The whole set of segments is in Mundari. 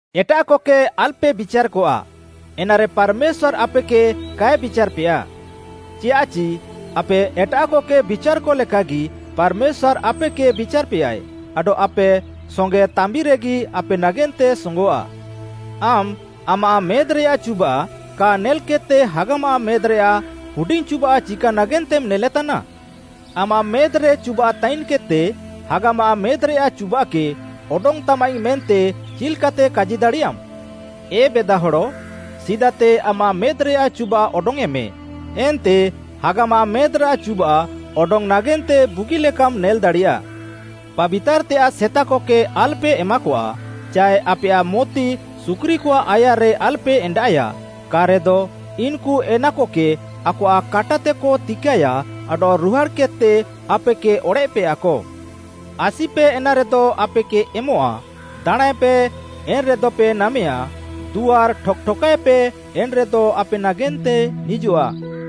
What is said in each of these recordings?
“ଏଟାଃକକେ ଆଲ୍‌ପେ ବିଚାର୍‌କଆ, ଏନାରେ ପାର୍‌ମେଶ୍ୱାର୍‌ ଆପେକେ କାଏ ବିଚାର୍‌ପେୟା। ଚିୟାଃଚି ଆପେ ଏଟାଃକକେ ବିଚାର୍‌କ ଲେକାଗି ପାର୍‌ମେଶ୍ୱାର୍‌ ଆପେକେ ବିଚାର୍‌ପେୟାଏ, ଆଡଃ ଆପେ ସଙ୍ଗେ ତାମ୍ବିରେଗି ଆପେ ନାଗେନ୍ତେ ସୋଙ୍ଗଃଆ। ଆମ୍‌ ଆମାଃ ମେଦ୍‌ରେଆଃ ଚୁବାଃ କା ନେଲ୍‌କେଦ୍‌ତେ ହାଗାମାଃ ମେଦ୍‌ରେଆଃ ହୁଡିଙ୍ଗ୍‌ ଚୁବାଃ ଚିକା ନାଗେନ୍ତେମ୍‌ ନେଲେତାନା? ଆମାଃ ମେଦ୍‍ରେ ଚୁବାଃ ତାଇନ୍‌କେଦ୍‌ତେ, ‘ହାଗାମାଃ ମେଦ୍‌ରେଆଃ ଚୁବାଃକେ ଅଡଙ୍ଗ୍‌ତାମାଇଙ୍ଗ୍‌’ ମେନ୍ତେ ଚିଲ୍‌କାତେ କାଜି ଦାଡ଼ିୟାମ୍‌? ଏ ବେଦାହଡ଼, ସିଦାତେ ଆମାଃ ମେଦ୍‌ରେଆଃ ଚୁବାଃ ଅଡଙ୍ଗ୍‌ୟେଁମେ, ଏନ୍ତେ ହାଗାମାଃ ମେଦ୍‌ରାଃ ଚୁବାଃ ଅଡଙ୍ଗ୍‌ ନାଗେନ୍ତେ ବୁଗିଲେକାମ୍‌ ନେଲ୍‌ଦାଡ଼ିୟା। “ପାବିତାର୍‌ତେୟାଃ ସେତାକକେ ଆଲ୍‌ପେ ଏମାକଆ ଚାଏ ଆପେୟାଃ ମୋତି ସୁକୁରିକଆଃ ଆୟାର୍‌ରେ ଆଲ୍‌ପେ ଏଣ୍ଡାଃଏୟା, କା'ରେଦ ଇନ୍‌କୁ ଏନାକକେ ଆକଆଃ କାଟାତେକ ତିକାଏୟା ଆଡଃ ରୁହାଡ଼୍‌କେଦ୍‌ତେ ଆପେକେ ଅଡ଼େଃପେୟାକ। “ଆସିପେ ଏନାରେଦ ଆପେକେ ଏମଃଆ, ଦାଣାଁଁଏପେ ଏନ୍‌ରେଦପେ ନାମେୟା, ଦୁଆର୍‌ ଠକ୍‌ ଠକାଏପେ ଏନ୍‌ରେଦ ଆପେ ନାଗେନ୍ତେ ନିଜଆଃ।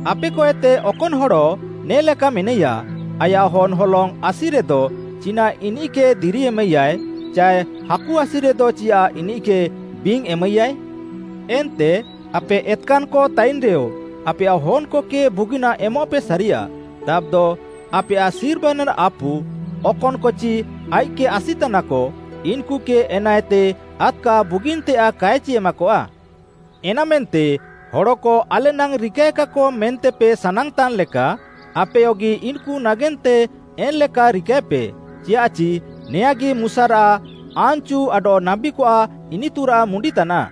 ଆପେକଏତେ ଅକନ୍‌ ହଡ଼ ନେ'ଲେକା ମେନାଇୟା, ଆୟାଃ ହନ୍‌ ହଲଙ୍ଗ୍‌ ଆସିରେଦ, ଚିନାଃ ଇନିଃକେ ଦିରି ଏମାଇୟାଏ, ଚାଏ ହାକୁ ଆସିରେଦ ଚିୟାଃ ଇନିଃକେ ବିଙ୍ଗ୍‌ ଏମାଇୟାଏ? ଏନ୍ତେ ଆପେ ଏତ୍‌କାନ୍‌କ ତାଇନ୍‌ରେୟ, ଆପେୟାଃ ହନ୍‌କକେ ବୁଗିନାଃ ଏମଃପେ ସାରିୟା, ତାବ୍‌ଦ ଆପେୟାଃ ସିର୍ମାରେନ୍‌ ଆପୁ, ଅକନ୍‌କଚି ଆଇଃକ୍‌କେ ଆସି ତାନାକ, ଇନ୍‌କୁକେ ଏନାଏତେ ଆଦ୍‌କା ବୁଗିନ୍‌ତେୟାଃ କାଏଚି ଏମାକଆ! “ଏନାମେନ୍ତେ ହଡ଼କ ଆଲେନାଙ୍ଗ୍‌ ରିକାଏକାକ ମେନ୍ତେପେ ସାନାଙ୍ଗ୍‌ତାନ୍‌ ଲେକା ଆପେୟଗି ଇନ୍‌କୁ ନାଗେନ୍ତେ ଏନ୍‌ଲେକା ରିକାଏପେ, ଚିୟାଃଚି ନେଆଁଁଗି ମୁଶାରାଃ ଆନ୍‌ଚୁ ଆଡଃ ନାବୀକଆଃ ଇନିତୁରାଃ ମୁଣ୍ଡିତାନାଃ।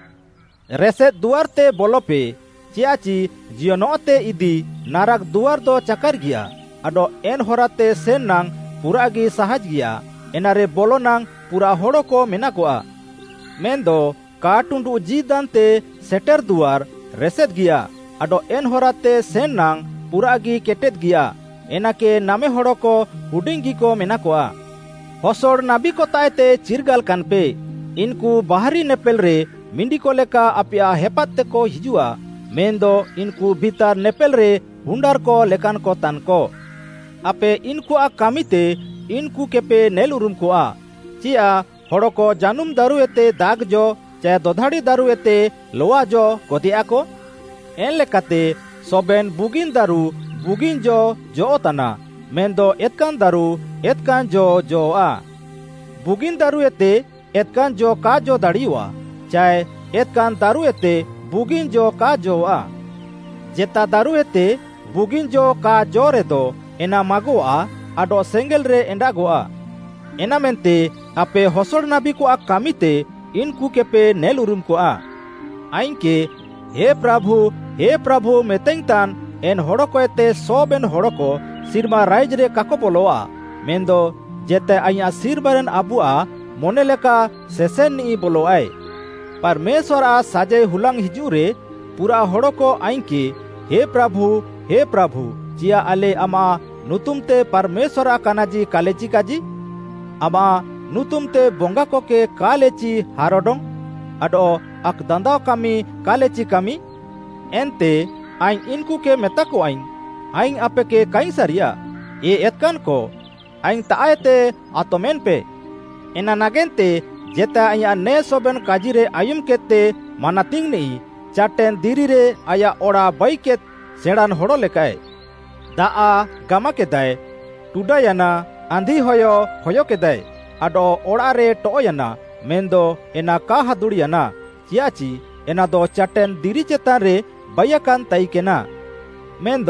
“ରେସେଦ୍‌ ଦୁଆର୍‌ତେ ବଲପେ, ଚିୟାଃଚି ଜିୟନଃତେ ଇଦି ନାରାକ୍‌ ଦୁଆର୍‌ଦ ଚାକାର୍‌ଗିୟା ଆଡଃ ଏନ୍‌ ହରାତେ ସେନ୍‌ ନାଙ୍ଗ୍‌ ପୁରାଃଗି ସାହାଜ୍‌ଗିଆ, ଏନାରେ ବଲନାଙ୍ଗ୍‌ ପୁରାଃ ହଡ଼କ ମେନାକଆ। ମେନ୍‌ଦ କା ଟୁଣ୍ଡୁ ଜୀଦାନ୍‌ତେ ସେଟେର୍‌ ଦୁଆର୍‌ ରେସେଦ୍‍ଗିଆ ଆଡଃ ଏନ୍‌ ହରାତେ ସେନ୍‌ ନାଙ୍ଗ୍‌ ପୁରାଃଗି କେଟେଦ୍‌ଗିୟା, ଏନାକେ ନାମେ ହଡ଼କ ହୁଡିଙ୍ଗ୍‌ଗି ମେନାକଆ। “ହସଡ଼ ନାବୀକତାଃଏତେ ଚିର୍ଗାଲାକାନ୍‌ପେ, ଇନ୍‌କୁ ବାହାରି ନେପେଲ୍‌ରେ ମିଣ୍ଡିକ ଲେକା ଆପେୟାଃ ହେପାଦ୍‌ତେକ ହିଜୁଃଆ, ମେନ୍‌ଦ ଇନ୍‌କୁ ଭିତାର୍‌ ନେପେଲ୍‌ରେ ହୁଣ୍ଡାର୍‌କ ଲେକାନ୍‌କ ତାନ୍‌କ। ଆପେ ଇନ୍‌କୁଆଃ କାମିତେ ଇନ୍‌କୁକେପେ ନେଲ୍‌ଉରୁମ୍‌କଆ। ଚିୟାଃ ହଡ଼କ ଜାନୁମ୍‌ ଦାରୁଏତେ ଦାଖ୍‌ ଜ ଚାଏ ଦଧାଡ଼ି ଦାରୁଏତେ ଲଆ ଜ ଗଦେୟାକ? ଏନ୍‌ ଲେକାତେ ସବେନ୍‌ ବୁଗିନ୍‌ ଦାରୁ ବୁଗିନ୍‌ ଜ ଜଅଃ'ତାନା ମେନ୍‌ଦ ଏତ୍‌କାନ୍‌ ଦାରୁ ଏତ୍‌କାନ୍‌ ଜ ଜଅଃ'ଆ। ବୁଗିନ୍‌ ଦାରୁଏତେ ଏତ୍‌କାନ୍‌ ଜ କା ଜ ଦାଡ଼ିୟଃଆ, ଚାଏ ଏତ୍‌କାନ୍‌ ଦାରୁଏତେ ବୁଗିନ୍‌ ଜ କା ଜଅଃ'ଆ। ଜେତା ଦାରୁଏତେ ବୁଗିନ୍‌ ଜ କା ଜ'ରେଦ, ଏନା ମାଗଃଆ ଆଡଃ ସେଙ୍ଗେଲ୍‌ରେ ଏଣ୍ଡାଗଃଆ। ଏନାମେନ୍ତେ ଆପେ ହସଡ଼ ନାବୀକଆଃ କାମିତେ ଇନ୍‌କୁକେପେ ନେଲ୍‌ଉରୁମ୍‌କଆ। “ଆଇଙ୍ଗ୍‌କେ ‘ହେ ପ୍ରାଭୁ, ହେ ପ୍ରାଭୁ’ ମେତାଇଙ୍ଗ୍‌ତାନ୍‌ ଏନ୍‌ ହଡ଼କଏତେ ସବେନ୍‌ ହଡ଼କ ସିର୍ମା ରାଇଜ୍‌ରେ କାକ ବଲଆ, ମେନ୍‌ଦ ଜେତାଏ ଆଇଁୟାଃ ସିର୍ମାରେନ୍‌ ଆପୁଆଃ ମନେଲେକା ସେସେନ୍‌ନିଃ ବଲଆଏ। ପାର୍‌ମେଶ୍ୱାର୍‌ଆଃ ସାଜାଇ ହୁଲାଙ୍ଗ୍‌ ହିଜୁଃରେ, ପୁରାଃ ହଡ଼କ ଆଇଙ୍ଗ୍‌କେ ‘ହେ ପ୍ରାଭୁ, ହେ ପ୍ରାଭୁ, ଚିୟାଃ ଆଲେ ଆମାଃ ନୁତୁମ୍‌ତେ ପାର୍‌ମେଶ୍ୱାର୍‌ଆଃ କାନାଜି କାଲେଚି କାଜି? ଆମାଃ ନୁତୁମ୍‌ତେ ବଙ୍ଗାକକେ କାଲେଚି ହାର୍‌ଅଡଙ୍ଗ୍‌? ଆଡଃ ଆକ୍‌ଦାନ୍ଦାଅ କାମି କାଲେଚି କାମି?’ ଏନ୍ତେ ଆଇଙ୍ଗ୍‌ ଇନ୍‌କୁକେ ମେତାକଆଇଙ୍ଗ୍‌, ‘ଆଇଙ୍ଗ୍‌ ଆପେକେ କାଇଙ୍ଗ୍‌ ସାରିୟାଃ, ଏ ଏତ୍‌କାନ୍‌କ, ଆଇଙ୍ଗ୍‌ତାଃଏତେ ଆତମେନ୍‌ପେ।’ “ଏନା ନାଗେନ୍ତେ ଜେତାଏ ଆଇଁୟାଃ ନେ ସବେନ୍‌ କାଜି ଆୟୁମ୍‌କେଦ୍‌ତେ ମାନାତିଙ୍ଗ୍‌ନିଃ, ଚାଟେନ୍‌ ଦିରିରେ ଆୟାଃ ଅଡ଼ାଃ ବାଇକେଦ୍‌ ସେଣାଁଁନ୍‌ ହଡ଼ ଲେକାଃଏ। ଦାଆଃ ଗାମାକେଦାଏ, ଟୁଡାୟାନା, ଆନ୍ଧିହୟ ହୟକେଦାଏ ଆଡଃ ଅଡ଼ାଃରେ ଟଅଃୟାନା, ମେନ୍‌ଦ ଏନା କା ହାଦୁଡ଼୍‌ୟାନା, ଚିୟାଃଚି ଏନାଦ ଚାଟେନ୍‌ ଦିରି ଚେତାନ୍‌ରେ ବାଇୟାକାନ୍‌ ତାଇକେନା। “ମେନ୍‌ଦ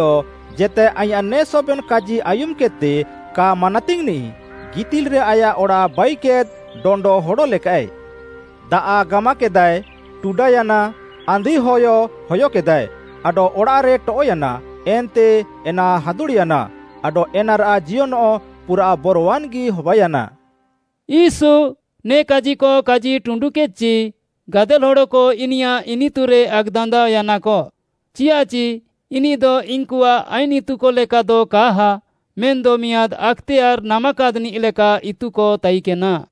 ଜେତାଏ ଆଇଁୟାଃ ନେ ସବେନ୍‌ କାଜି ଆୟୁମ୍‌କେଦ୍‌ତେ କା ମାନାତିଙ୍ଗ୍‌ନିଃ, ଗିତିଲ୍‌ରେ ଆୟାଃ ଅଡ଼ାଃ ବାଇକେଦ୍‌ ଡଣ୍ଡ ହଡ଼ ଲେକାଃଏ। ଦାଆଃ ଗାମାକେଦାଏ, ଟୁଡାୟାନା, ଆନ୍ଧିହୟ ହୟକେଦାଏ ଆଡଃ ଅଡ଼ାଃରେ ଟଅଃୟାନା, ଏନ୍ତେ ଏନା ହାଦୁଡ଼୍‌ୟାନା, ଆଡଃ ଏନାରାଃ ଜିୟନଃ ପୁରାଃ ବରୱାନ୍‌ଗି ହବାୟାନା।” ୟୀଶୁ ନେ କାଜିକ କାଜିଟୁଣ୍ଡୁକେଦ୍‍ଚି, ଗାଦେଲ୍‌ ହଡ଼କ ଇନିୟାଃ ଇନିତୁରେ ଆକ୍‌ଦାନ୍ଦାଅୟାନାକ, ଚିୟାଃଚି ଇନିଃଦ ଇନ୍‌କୁଆଃ ଆଇନ୍‌ ଇତୁକ ଲେକାଦ କାହା, ମେନ୍‌ଦ ମିଆଁଦ୍‌ ଆକ୍‌ତେୟାର୍‌ ନାମାକାଦ୍‌ନିଃଲେକା ଇତୁକ ତାଇକେନା।